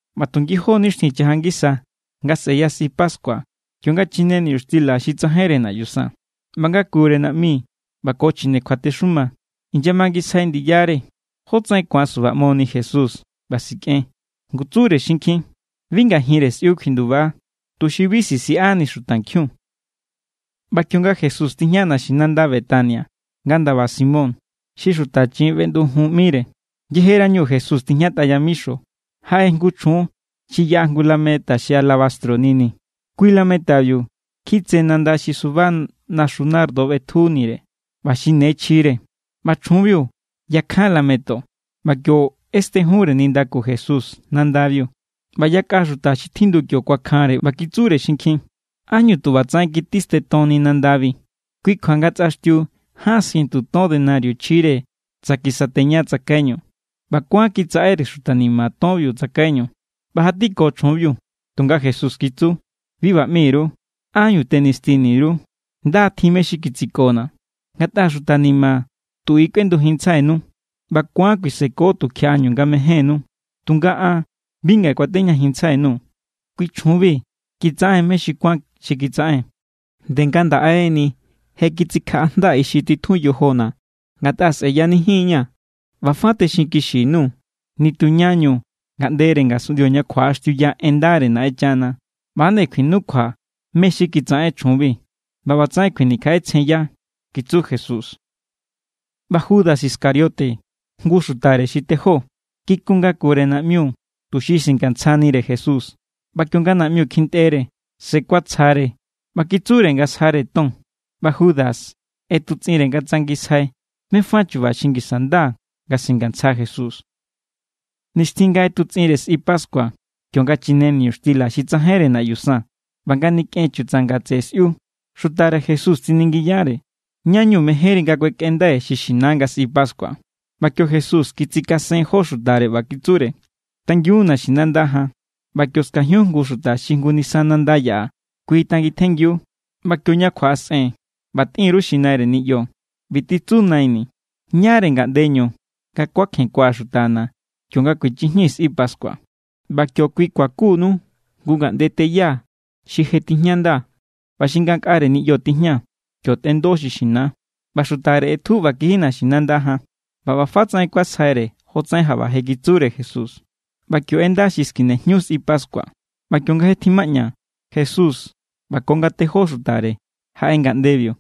ꞌBa tu ngijó= nixtjin chaja ngisa nga sꞌe̱ya sꞌi pascua kionga chine niñuxtila xi tsajainre naꞌyu san. ꞌBa ngakure naꞌmi ꞌba ko chjine kjuatexuma inyamangisjai ndiyare jótsaꞌen ku̱an subaꞌmoni Jesús, ꞌba sikꞌen. Ngu tsure xinkjin: —Bi ngajinre sꞌiu kjuinduba, tuxi bi sisiꞌani xutankjiun. ꞌBa kionga Jesús tijña naxinanda Betania, nga ndaba Simón, xi xuta chiꞌin feꞌndujun ꞌmire; yejerañu Jesús tijñatꞌa yamixo, jaꞌe jngu chjun xi yaꞌa jngu lameta xi alabastro nini. Kui= lametabiu kjitse nanda xi suba naxu nardo ꞌbejunire ꞌba xi ne chjire. ꞌBa chjunbiu yakjan lameto ꞌba kio ꞌestenjunre nindaku Jesús nandabiu. ꞌBa yakꞌa xuta xi tjindu kio kuakjanre, ꞌba kitsure xinkjin: —¿Ánñu tu ꞌba tsaꞌen kitistentonni nandabi? Kui kjua nga tsꞌaxtiu ján sientu ton denario chjire tsa kisateña tsakaiñu, ꞌba kuán kitsaꞌere xuta ni̱ma̱ tonbiu tsakaiñu. ꞌBa jatiko chjunbiu. Tunga Jesús kitsu: —Bi ꞌba ꞌmi_ru; ¿ánñu tenistini_ru? Nda= tjin mé= xi kitsikona̱. Ngatꞌa xuta ni̱ma̱ tu i= tjindujinntsjainu, ꞌba ku̱an kuiseko tu kjiaꞌañu nga mejénnú; tunga an bi ngaꞌe kuatejñajinntsjai_nuu̱. Kui= chjunbiu kitsaꞌen= mé= xi kuán xi kitsaꞌen; nde ngandaꞌe=ni je kitsikjaꞌajnda ixi titjun yojona̱ ngatꞌa sꞌe̱yanijin=ña̱. ꞌBa fa texinkixi_nuu̱, nitu ñañu ngaꞌndere ngasunꞌndio ña kjuaꞌaxtiuya en ndare Naꞌenchana, ꞌba=nde kjuinukjua mé= xi kitsaꞌen chjunbi, ꞌba ꞌbatsaꞌen kjuinikjaꞌetsjenya —kitsu Jesús. ꞌBa Judas Iscariote, jngu xutare xi tejó, kikun ngakure naꞌmiu tuxi singantsjanire Jesús. ꞌBa kionga naꞌmiu kjintꞌere, se kuatsja=re, ꞌba kitsure nga sjare ton. ꞌBa Judas ꞌetutsꞌinre nga tsangisjai mé= fa chu̱ba̱ xi ngisa nda nga singantsja Jesús. Nixtjin nga ꞌetutsꞌinre sꞌi pascua kionga chine niñuxtila xi tsajainre naꞌyu san ꞌba nga nikꞌen chutsanga tseꞌe sꞌiu, xutare Jesús tsiningiyare: —¿Ñáñu mejénri nga kuekꞌendai xi xina nga sꞌi pascua? ꞌBa kio Jesús kitsikasen jó xutare ꞌba kitsure: —Tangiun naxinanda jan. ꞌBa kio skajiun jngu xuta xi jngu nisa nanda yaꞌa. Kui= tangintjenngiu. ꞌBa kioña kjuaꞌasꞌen, ꞌba tꞌin_ru xi naire niꞌyo: “ꞌBi titsu Naini̱: ¿Ñáre ngaꞌndeñu nga kuakjenkua̱ xutana̱ kionga kuechjijñii̱ sꞌi pascua?” ꞌBa kio kui kuakunu jngu ngaꞌnde teya xi je tijñanda ꞌba xi ngankꞌare niꞌyo tijña. Kio tꞌendo xi xina. ꞌBa xutare ꞌetju ꞌba kiji naxinanda jan. ꞌBa ꞌba fa tsaꞌen kuasjaire jotsaꞌen jaꞌba je kitsure Jesús. ꞌBa kio ꞌenda xi skinejñu sꞌi pascua. ꞌBa kionga je tjimaꞌña, Jesús ꞌba ko nga tejó xutare jaꞌe ngaꞌndebiu.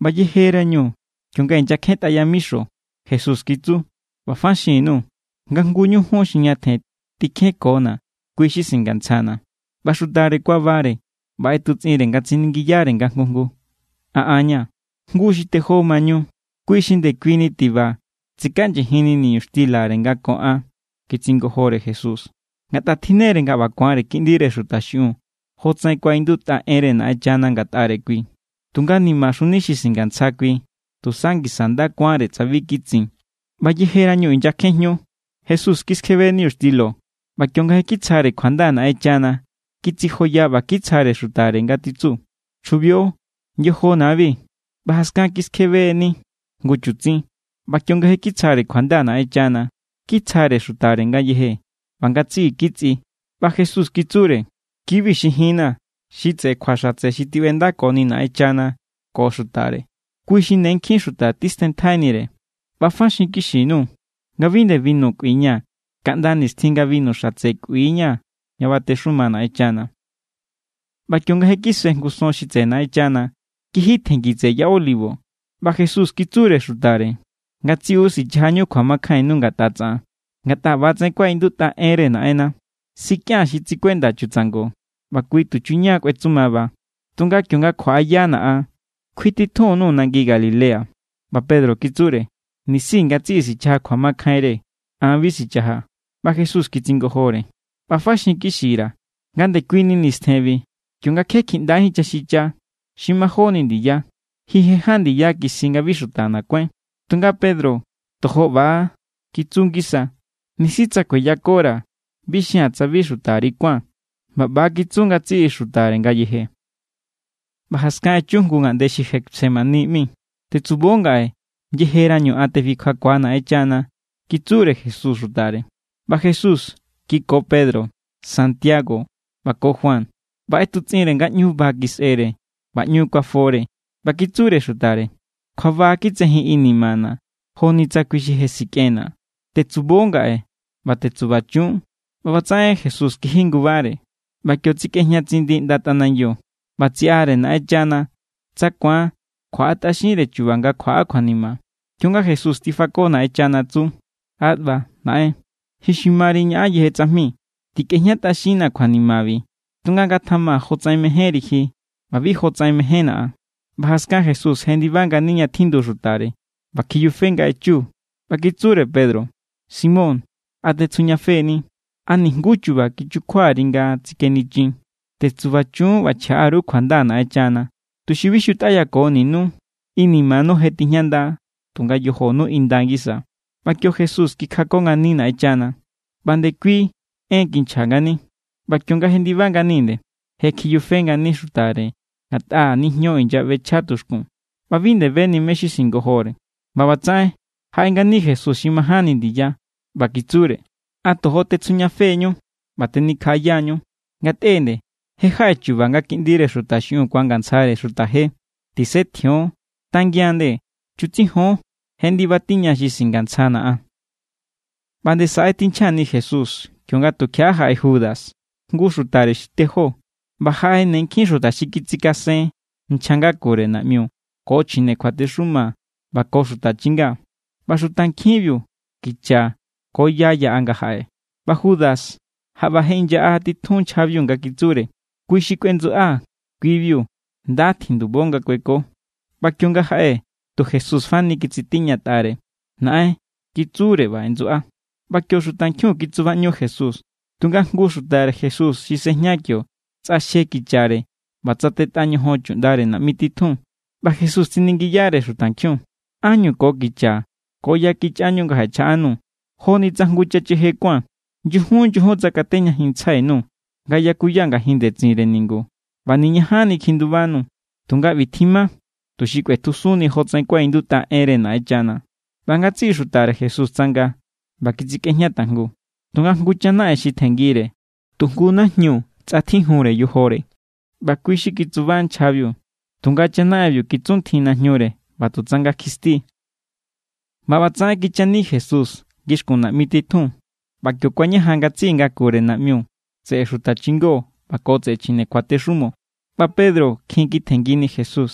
ꞌBa yejerañu kionga inyakjentꞌa yamixo, Jesús kitsu: —ꞌBa fa xinkixi_nuu̱ nga jngu ñu jun xi ñatjen tikjenkona̱, kui= xi singantsjana̱. ꞌBa xutare kuabare, ꞌba ꞌetutsꞌinre nga tsiningiyare nga jngu jngu: —¿A an= ña̱? —Jngu xi tejó mañu, kui= xi ndekuini tiba titsikaꞌnyijinni niñuxtilare nga ko an —kitsingojore Jesús—. Ngatꞌa tjinnere ꞌba ku̱anre Kiꞌndire Xuta xiꞌiun jotsaꞌen kuaꞌindutꞌa enre Naꞌenchana ngatꞌare kui. Tunga nimaxuni xi singantsja kui. Tusa ngisa nda kuánre tsa bi kitsin. ꞌBa yejerañu inyakjenjñu, Jesús kiskjebe niñuxtilo ꞌba kionga je kitsjare kjuanda Naꞌenchana, kitsijoya ꞌba kitsjare xutare nga titsu: —Chjubio. Yojona̱=bi. ꞌBa jaskan kiskjebe=ni jngu chutsin. ꞌBa kionga je kitsjare kjuanda Naꞌenchana, kitsjare xutare ngayeje. ꞌBa ngatsiꞌi kitsꞌi. ꞌBa Jesús kitsure: —Kibi= xi jinna̱ xi tseꞌe kjua xatse xi tiꞌbendakoni Naꞌenchana ko xutare. Kui= xi ne nkjin xuta tistenntjainire. ꞌBa fa xinkixi_nuu̱ nga bi nde binu kꞌuiña̱ kaꞌnda nixtjin nga binu xatse kꞌuia̱ ña batexuma Naꞌenchana. ꞌBa kionga je kise jngu son xi tseꞌe Naꞌenchana, kiji tjenngi tseꞌe Ya Olivo. ꞌBa Jesús kitsure xutare: —Ngatsiꞌu sichajañu kjuamakjainnu ngatꞌa tsaꞌan; ngatꞌa ꞌba=tsaꞌen kuaꞌindutꞌa enre Naꞌenna: “Sikꞌía̱n xi tsikuenda chutsango, ꞌba kui tuchuña kꞌuetsumaba.” Tunga kionga kjuaꞌayana̱ an, kjuititjun_nuu̱ nangi Galilea. ꞌBa Pedro kitsure: —Nisi ngatsiꞌi sichaja kjuamakjainre, an bi sichajaa̱. ꞌBa Jesús kitsingojore: —ꞌBa fa xinkixira̱ nga ndekuini nistjenbi, kionga kje kjiꞌndajín chaxicha xi majóni ndiya, ji je ján ndiya kisji nga bi xutana̱ kuáin. Tunga Pedro tojo ꞌba= kitsu ngisa: —Nisi tsa kueyakora̱, bi xia̱n tsa bi xutari kuán. ꞌBa ꞌba= kitsu ngatsiꞌi xutare ngayeje. ꞌBa jaskan echu jngu ngaꞌnde xi Getsemaní ꞌmi. —Tetsubo ngaꞌe yejerañu an tefikjakuaa̱ Naꞌenchana —kitsure Jesús xutare. ꞌBa Jesús kiko Pedro, Santiago ꞌba ko Juan, ꞌba ꞌetutsꞌinre nga ꞌñu ba kisꞌere ꞌba ꞌñu kuafore. ꞌBa kitsure xutare: —Kjuaba kitsejin inimana̱ joni tsa kui xi je sikꞌenna̱. Tetsubo ngaꞌe, ꞌba tetsubachun. ꞌBa ꞌbatsaꞌen Jesús kiji ngubare, ꞌba kio tsakꞌejña tsindi ꞌnda tꞌanangiu, ꞌba tsiꞌare Naꞌenchana tsa ku̱an kjuaꞌatꞌaxinre chu̱ba̱ nga kjuaꞌa kjuanima. Kionga Jesús tifako Naꞌenchana tsu: —Abbá Naꞌen, ji xi mari ñaꞌan yeje tsajmi; tikꞌejñatꞌaxinnaa̱ kjuanimabi, tunga ngatjama jotsaꞌen mejénri ji, ꞌba bi jotsaꞌen mejénna̱ an. ꞌBa jaskan Jesús jendiba ngani ña tjindu xutare, ꞌba kjiyufe nga echu; ꞌba kitsure Pedro: —Simón, ¿a tetsjujñafe=ni? ¿A nijnguú chu̱ba̱ kichukjuari nga tsikenichin? Tetsubachun ꞌba chjaꞌa_ru kjuanda Naꞌenchana, tuxi bi xutꞌayakoninú. Inimanu je tijñanda=, tunga yojonu inda ngisa. ꞌBa kio Jesús kikjako ngani Naꞌenchana, ꞌba ndekuini en kinchja ngani. ꞌBa kionga jendiba ngani nde, je kjiyufe ngani xutare ngatꞌa nijño inyaꞌbechja tuxkun. ꞌBa bi nde beni mé= xi singojore. ꞌBa ꞌbatsaꞌen, jaꞌe ngani Jesús xi majánni ndiya, ꞌba kitsure: —¿A tojo tetsjujñafe=ñu ꞌba tenikjaꞌaya=ñu? Ngatꞌe nde, je jaꞌe chu̱ba̱ nga Kiꞌndire Xuta xiꞌiun ku̱angantsjare xuta je. Tisetjion, tangian nde. Chutsijon, je ndiba tiña xi singantsjana̱ an. ꞌBa nde saꞌe= tinchjani Jesús kionga tukjiaꞌa jaꞌe Judas, jngu xutare xi tejó, ꞌba jaꞌe ne nkjin xuta xi kitsikasen nchja ngakure naꞌmiu, ko chjine kjuatexuma ꞌba ko xuta chinga. ꞌBa xutankjiun kicha= ko ya= yaꞌa nga jaꞌe. ꞌBa Judas jaꞌba je inyaꞌa titjun nchjabiu nga kitsure: —Kui xi kꞌuendsuꞌaa̱, kui=biu; nda tjindubo nga kueko. ꞌBa kionga jaꞌe, tu Jesús fani kitsitiñatꞌare. —Naꞌen —kitsure ꞌba ꞌendsuꞌa. ꞌBa kio xutankjiun kitsubaꞌñu Jesús. Tunga jngu xutare Jesús xi sejña kio tsꞌaxje kichare ꞌba tsatetꞌa ñojon chuꞌndare naꞌmi titjun. ꞌBa Jesús tsiningiyare xutankjiun: —¿Ánñu ko kicha ko ya kichꞌañu nga jaꞌechjaꞌanuu̱, joni tsa jngu chacheje kuáa̱n? Nyujun nyujun tsakatejñajinntsjai_nuu̱ nga yakuya ngajin ndetsinre ningu, ꞌba niñajanni kjindubanuu̱. Tunga ꞌbi tjima tuxi kꞌuetjusunni jotsaꞌen kuaꞌindutꞌa enre Naꞌenchana. ꞌBa ngatsiꞌi xutare Jesús tsanga ꞌba kitsikꞌejña tajngu. Tunga jngu chanaꞌen xi tjenngire, tu jngu najñu tsꞌatjijunre yojore, ꞌba kui xi kitsuba nchjabiu; tunga chanaꞌenbiu kitsuntjin najñure, ꞌba tu tsanga kjisti=. ꞌBa ꞌbatsaꞌen kichani Jesús ngixkun naꞌmi titjun; ꞌba kio kuañajan ngatsiꞌi ngakure naꞌmiu, tseꞌe xuta chingo ꞌba ko tseꞌe chjine kjuatexumo. ꞌBa Pedro kjin kitjenngini Jesús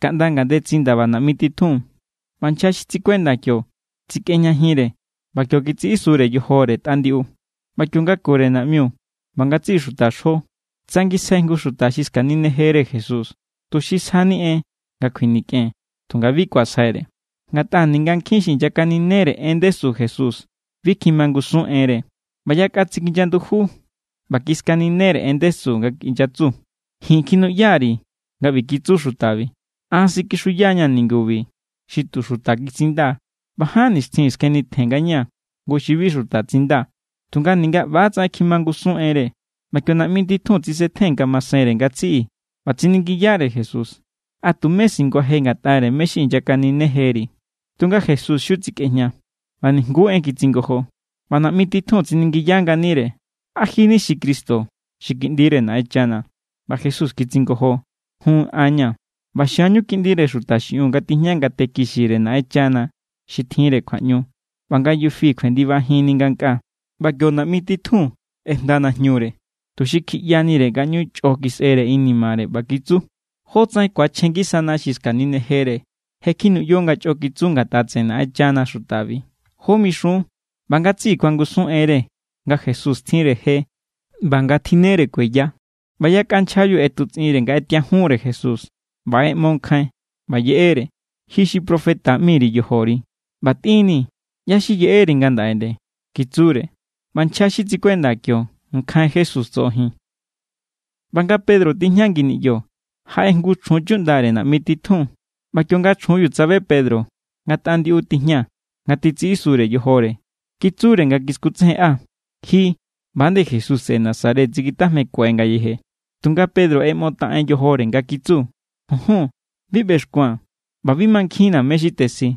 kaꞌnda ngandetsin ndaba naꞌmi titjun, ꞌba nchja xi tsikuenda kio tsikꞌejñajinre. ꞌBa kio kitsiꞌisure yojore tꞌa ndiꞌu. ꞌBa kiongakure naꞌmiu ꞌba ngatsiꞌi xuta xo tsangisjai jngu xuta xi skaninejere Jesús, tuxi sjani en nga kjuinikꞌen; tunga bi kuasjaire. Ngatꞌa ninga nkjin xi inyakaninere en ndesu Jesús, bi kjimangusun enre. ꞌBa yakꞌa tsikinya nduju ꞌba kiskaninere en ndesu, nga inyatsu: —Ji̱n kjinuꞌya_ri̱ nga kitsu xutabi: “An sikixuya=ña̱ ningubi xi tu xuta kitsinda, ꞌba ján nixtjin skjenitjen ngañaa̱ jngu xi bi xuta tsinda.” Tunga ninga ꞌba= tsaꞌen kjimangusun enre. ꞌBa kio naꞌmi titjun tsisetjen ngamasenre ngatsiꞌi, ꞌba tsiningiyare Jesús: —¿A tumé singuaje ngatꞌare mé= xi inyakaninejeri? Tunga Jesús xiu tsikꞌejña, ꞌba nijnguú en kitsingojo. ꞌBa naꞌmi titjun tsiningiya nganire: —¿A ji= ni Cristo, xi Kiꞌndire Naꞌenchana? ꞌBa Jesús kitsingojo: —Jun, an= ña̱. ꞌBa xia=ñu Kiꞌndire Xuta xiꞌiun nga tijña ngate kixire Naꞌenchana xi tjinre kjuaꞌñu, ꞌba nga yufi kjuendibajinni ngankꞌaa. ꞌBa kio naꞌmi titjun ꞌejnda najñure tuxi kjiꞌyanire nga ꞌñu chꞌo kisꞌere inimare, ꞌba kitsu: —¿Jótsaꞌen ku̱achjen ngisana xi skaninejere? Je kjinuꞌyo nga chꞌo kitsu ngatꞌa tseꞌe Naꞌenchana xutabi; ¿jó mixun? ꞌBa ngatsiꞌi kuangusun enre nga Jesús tjinre je ꞌba nga tjinnere kueya. ꞌBa yakꞌa nchjabiu ꞌetutsꞌinre nga ꞌetiajunre Jesús, ꞌba ꞌeꞌmo nkjain ꞌba yeꞌere. —Ji xi profeta ꞌmi_ri yojori, ꞌba tꞌinnii̱, ¿ꞌyá= xi yeꞌeri ngandaꞌe nde? —kitsure. ꞌBa nchja xi tsikuenda kio nkjain Jesús tsoꞌojin. ꞌBa nga Pedro tijña ngi niꞌyo, jaꞌe jngu chjun chuꞌndare naꞌmi titjun; ꞌba kionga chjunbiu tsabe Pedro nga tꞌa ndiꞌu tijña nga titsiꞌisure yojore, kitsure nga kiskutsejenꞌa: —Ji ꞌba=nde Jesús tseꞌe Nazaret tsikitjajmekue ngayeje. Tunga Pedro ꞌeꞌmotaꞌen yojore, nga kitsu: —Junjun. Bi ꞌbexkua̱n, ꞌba bi mankjinna̱ mé= xi tesji.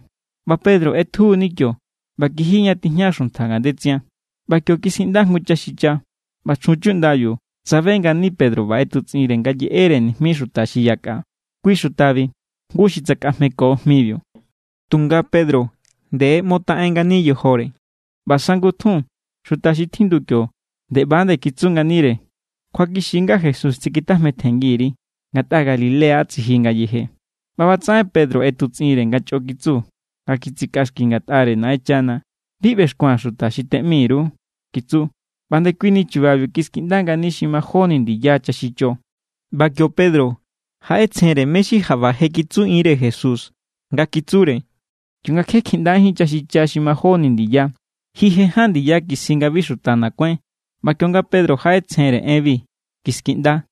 ꞌBa Pedro ꞌetjuuni kio ꞌba kiji ña tijña xuntja ngandetsin. ꞌBa kio kiskiꞌnda jngu chaxicha. ꞌBa chjun chuꞌndabiu tsabe ngani Pedro ꞌba ꞌetutsꞌinre nga yeꞌere nijmi xuta xi yakꞌa: —Kui xutabi jngu xi tsakꞌajmeko jmibiu. Tunga Pedro nde ꞌeꞌmotaꞌen ngani yojore. ꞌBa sangutjun, xuta xi tjindu kio nde ꞌba= kitsu nganire: —Kjuakixi= nga Jesús tsikitjajmetjenngi_ri, ngatꞌa Galilea tsiji ngayeje. ꞌBa ꞌbatsaꞌen Pedro ꞌetutsꞌinre nga chꞌo kitsu, nga kitsikꞌaxki ngatꞌare Naꞌenchana: —Bi ꞌbexkua̱n xuta xi teꞌmi_ru —kitsu. ꞌBa ndekuini chubabiu kiskiꞌnda ngani xi majóni ndiya chaxicho. ꞌBa kio Pedro jaꞌetsjenre mé= xi jaꞌba je kitsuꞌinre Jesús nga kitsure: “Kionga kje kjiꞌndajín chaxicha xi majóni ndiya, ji je ján ndiya kisji nga bi xutana̱ kuáin.” ꞌBa kionga Pedro jaꞌetsjenre enbi, kiskiꞌnda.